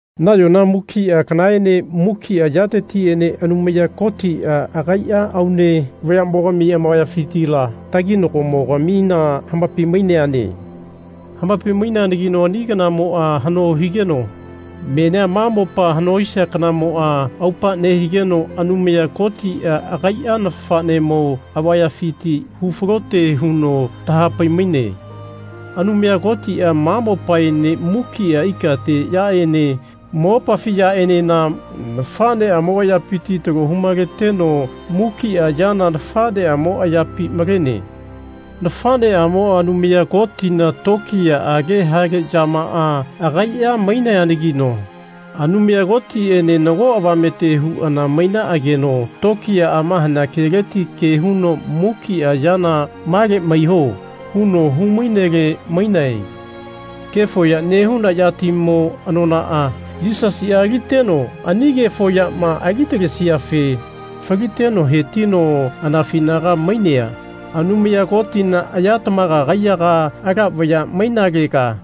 Nayona mukia kanaene mukia yatetiene Anumaya Kotia agaia aune vayamogami amavayafitila taginagomo-gamina hamapai-maineane. Hamapai-maineanagino ani kanamoa hano higeno menia ma mopa hano hisia kanamoa aupa nehigeno Anumaya Kotia agaia nafanemo avayafiti hu falote huno tahapai-maine. Anumaya Kotia ma mopaene mukia ikate yaene mopafi yaenena nafaneamo ayapiti talo hu-maleteno mukia yana nafaneamo ayapi malene. Nafaneamoa Anumaya Kotina tokiyaage hale yamaa agaia maineanagino Anumaya Kotiene nago avamete huana mainaageno tokiyaama hanea keleti ke huno mukia yana Male maiho. huno hu-mainele mainae. Kefo ya nehuna yatimo anonaa Yisasia aliteno ani kefo yama ali talesiafe faliteno hetino anafinaga mainea Anumaya Kotina aya tamaga kaiyaga, ala vaya mainalega,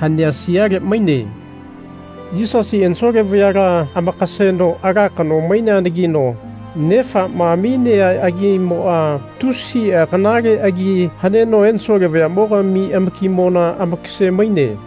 hanea siale maine. Yisasia ensole vayala amakaseno ala kano maineanagino Nefama aminea agimoa tusia kanale agi haneno ensole vayamogami amakimona amakase-maine.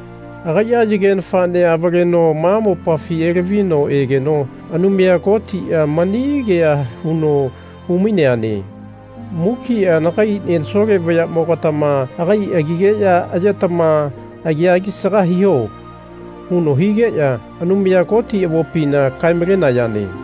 Agaia yage nafanea avaleno ma mopafi elavino egeno Anumaya Kotia mani kea huno hu-maineane Mukia nagai ensole vayamogatama agai agigeya ayetama agia alisaga hiho. huno higeya Anumaya Koti avopina kae-malenayane.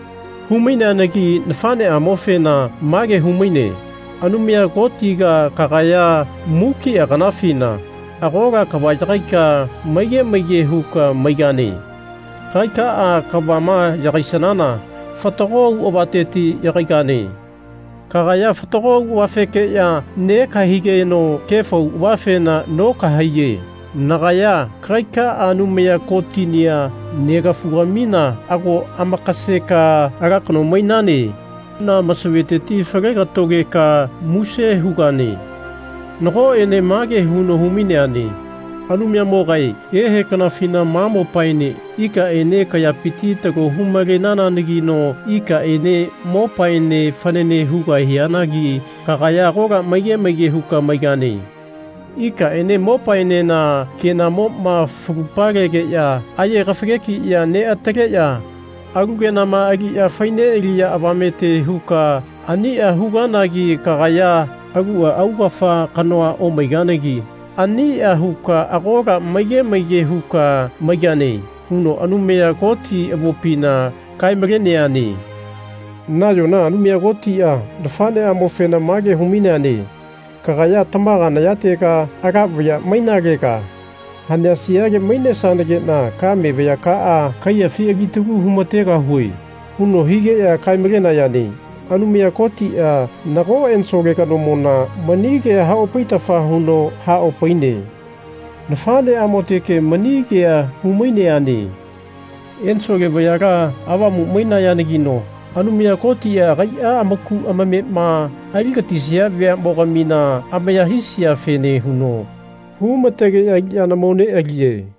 Hu-maineanagi nafaneamofena mage hu-maine Anumaya Kotiga kagaya mukia kanafina agola kava yagaika maige maige huka maigane. Kagaikaa kavama yagaisanana fatago auavateti yagaigane. Kagaya fatago auavafekeya negahaigeno kefo auavafena nokahaiyafe nagaya kagaikaa Anumaya Kotinia Negafugamina ago amakaseka ala kano mainane. huna masaveteti falegatogeka muse hugane. Nagoene mage huno hu-maineane Anumayamogae ehe kanafina ma mopaene ikaene kayapiti talo hu-malenananagino ikaene mopaene fanane hugahianagi kagaya agola maige maige huka maigane. Ikaene mopaenena kenamoma falu-palegeya aye kafagegiya neataleya alu kenama aliya fai nealiya avamete huka ania huganagi kagaya alua augafa kanoa omaiganagi ania huka agola maige maige huka maigane. huno Anumaya Koti avopina kae-maleneane. Nayona Anumaya Kotia nafaneamofena mage hu-maineane Kagaya tamaga nayatega, ala vaya mainalega, hanea siale mainesanagena kame vayakaa kaiyafi alitalu humategahue. huno higeya kae-malenayane. Anumaya Kotia nago ensole kanomona mani kea haopaitafa huno haopaine. Nafaneamoteke mani kea hu-maineane. Ensole vayala avamu mainayanagino Anumaya Kotia agaia amaku amamema ali gatisia veamogamina amaya hisiafene huno humategeya aliyana mo nealiye.